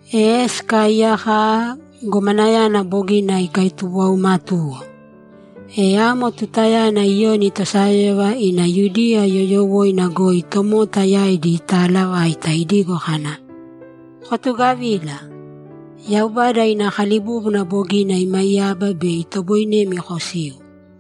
E sikaaiyaka aaa, gomanayana bogina ikaitubuwaumatuwo. E amo tutayana Iyoni tosayóyova ina Yudiya yoyowoina goi tomota yaidi itaalavaita idigo kana, ‘Kotugavīla! Yaubada ina kalibúbuna bogina imaiyaba bei itoboinemi kosiu.’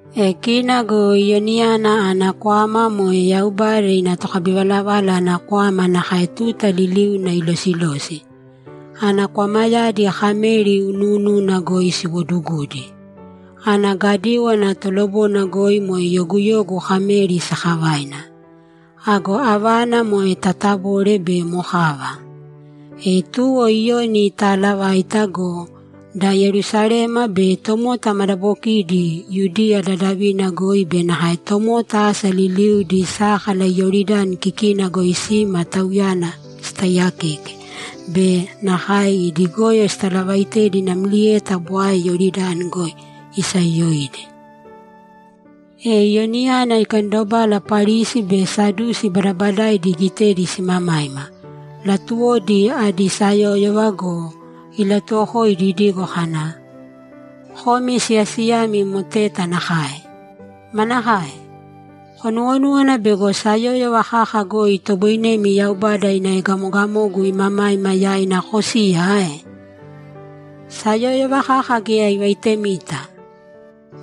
E kina go Iyoniyana ana kwama moe Yaubada ina tokabivalavala ana kwama nakae tuta liliuna ilosilosi. Ana kwamayadi kameri unuununa goi siwodugudi. Ana gadíwana tolobona goi moe yoguyogu kameri sakavaina. Ago avana moe tatabole be mokava. E tuwo Iyoni itaalavaita go, da Yerusalema be tomota madabokidi Yudiya dadavina goi be nakae tomota asa liliudi sákala Iyoridani kikina goi sima tauyana sitaiyakeke be nakae idi goyo sitalavaitedi namlieta bwae Iyoridani goi isayoyoidi. E Iyoniyana ikandobala Parisi be Sadusi badabadaidi igitedi simamaima; latuwodi adi sayóyova go, ilatuwokoidi idigo kana, ‘Komi siyasiyaimi moteta nakae! Manakae? Konuwonúwana bego sayóyova kaka goi itoboinemi Yaubada ina egamogamogu imamaima yaina kosiya ae? Sayóyova kaka geya ivaitemita!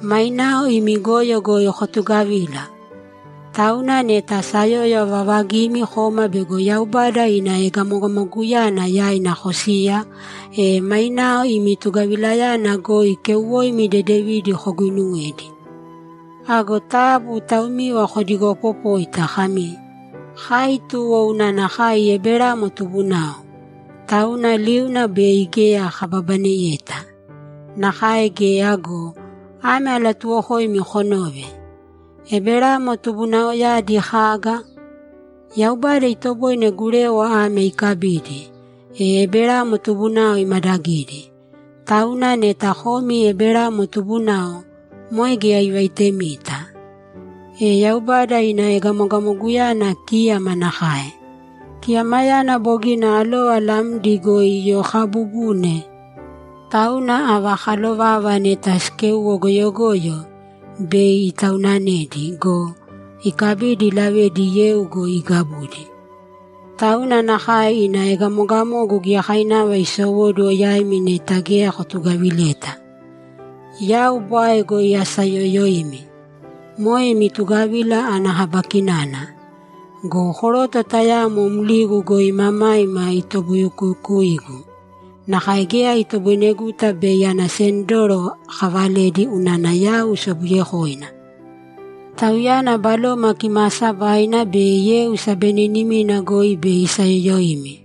Mainao imi goyo goi kotugavīla! Tauna neta sayóyova vavagimi koma bego Yaubada ina egamogamoguyana yaina kosiya, e mainao imi tugavilayana goi keuwoimi dedevidi koguinuwēdi. Ago taabu taumiva kodigoopopōita kami, “Kai tuwo unana kai Eberamo tubunao, tauna liuna bei geya kababaneyeta.” Nakae geya go, ame alatuuwokoimi konōve: Eberamo tubunaoyadi kaga? Yaubada itoboine gurewa ame ikabidi, e Eberamo tubunao imadagidi. Tauna neta komi Eberamo tubunao, moe geya ivaitemita. E Yaubada ina egamogamoguyana kíyama nakae. Kiyamayana bogina alova lamdi goi iyokaabubune, tauna ava kalovava neta sikéuwo goyogoyo, bei itaunanedi go, ikabidi ilavedi yeu goi igabudi. Tauna nakae ina egamogamogu giyakainava isowóduwo yaimi neta geya kotugavileta. Yau bwae goi asaayoyoimi. Moe imi tugavila ana kaba kinana. Go koroto tayamo mligu goi imamaima itobukukuyuigu; nakae geya itoboineguta bei ana sendoro akavaledi unana yau sobuyekoina. Tauyana Baloma Kimaasabaina be yeu sabeninimina goi bei isayoyoimi.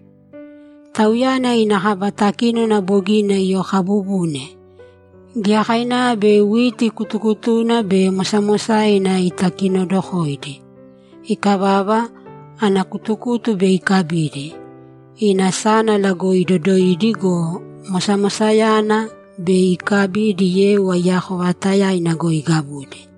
Tauyana ina kaba takínona bogina iyokaabubune; giyakainava bei witi kutukutuna be mosamosaina itakinodokoidi. Ikavava, ana kutukutu bei ikabidi, ina sánala goi idodoidi go, mosamosayana, bei ikabidi yeu aiyako vaatayaina goi igabudi.’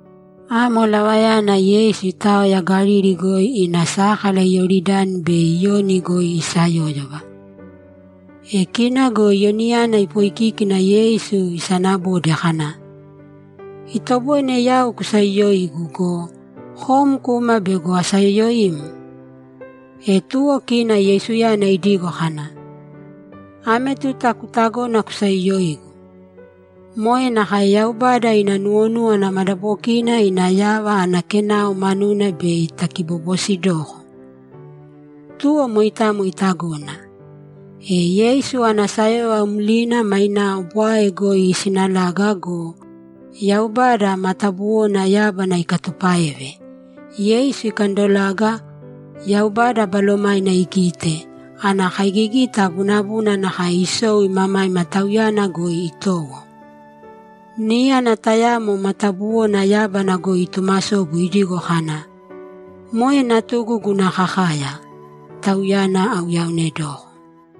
Amo lavayana Yeisu itaoya Galili goi ina sákala Iyoridani bei Iyoni goi isayóyova. E kina go Iyoniyana ipoikíkina Yeisu isanabode kana, ‘Itoboine yau kusayoyoigu go, kom kuma bego asayoyoim?’ E tuwo kina Yeisuyana idigo kana, ‘Ame tuta kutagōna kusayoyoigu. Moe nakae Yaubada ina nuwonúwana madabokina ina yava ana kenao manuna bei takibobosidoko.’ Tuwo moitamo itagona. E Yeisu ana sayóyova mlina mainao bwae goi isinalaga go, Yaubada matabuwona yábana ikatupáeve. Yeisu ikandolaga, Yaubada Balomaina igite, ana kaigigita bunabuna nakae isou imamaima Tauyana goi itowo. Níyana tayamo matabuwona yábana goi itumasobu idigo kana, ‘Moe natugu guna kakaya. Tauyana auyaonedoko.’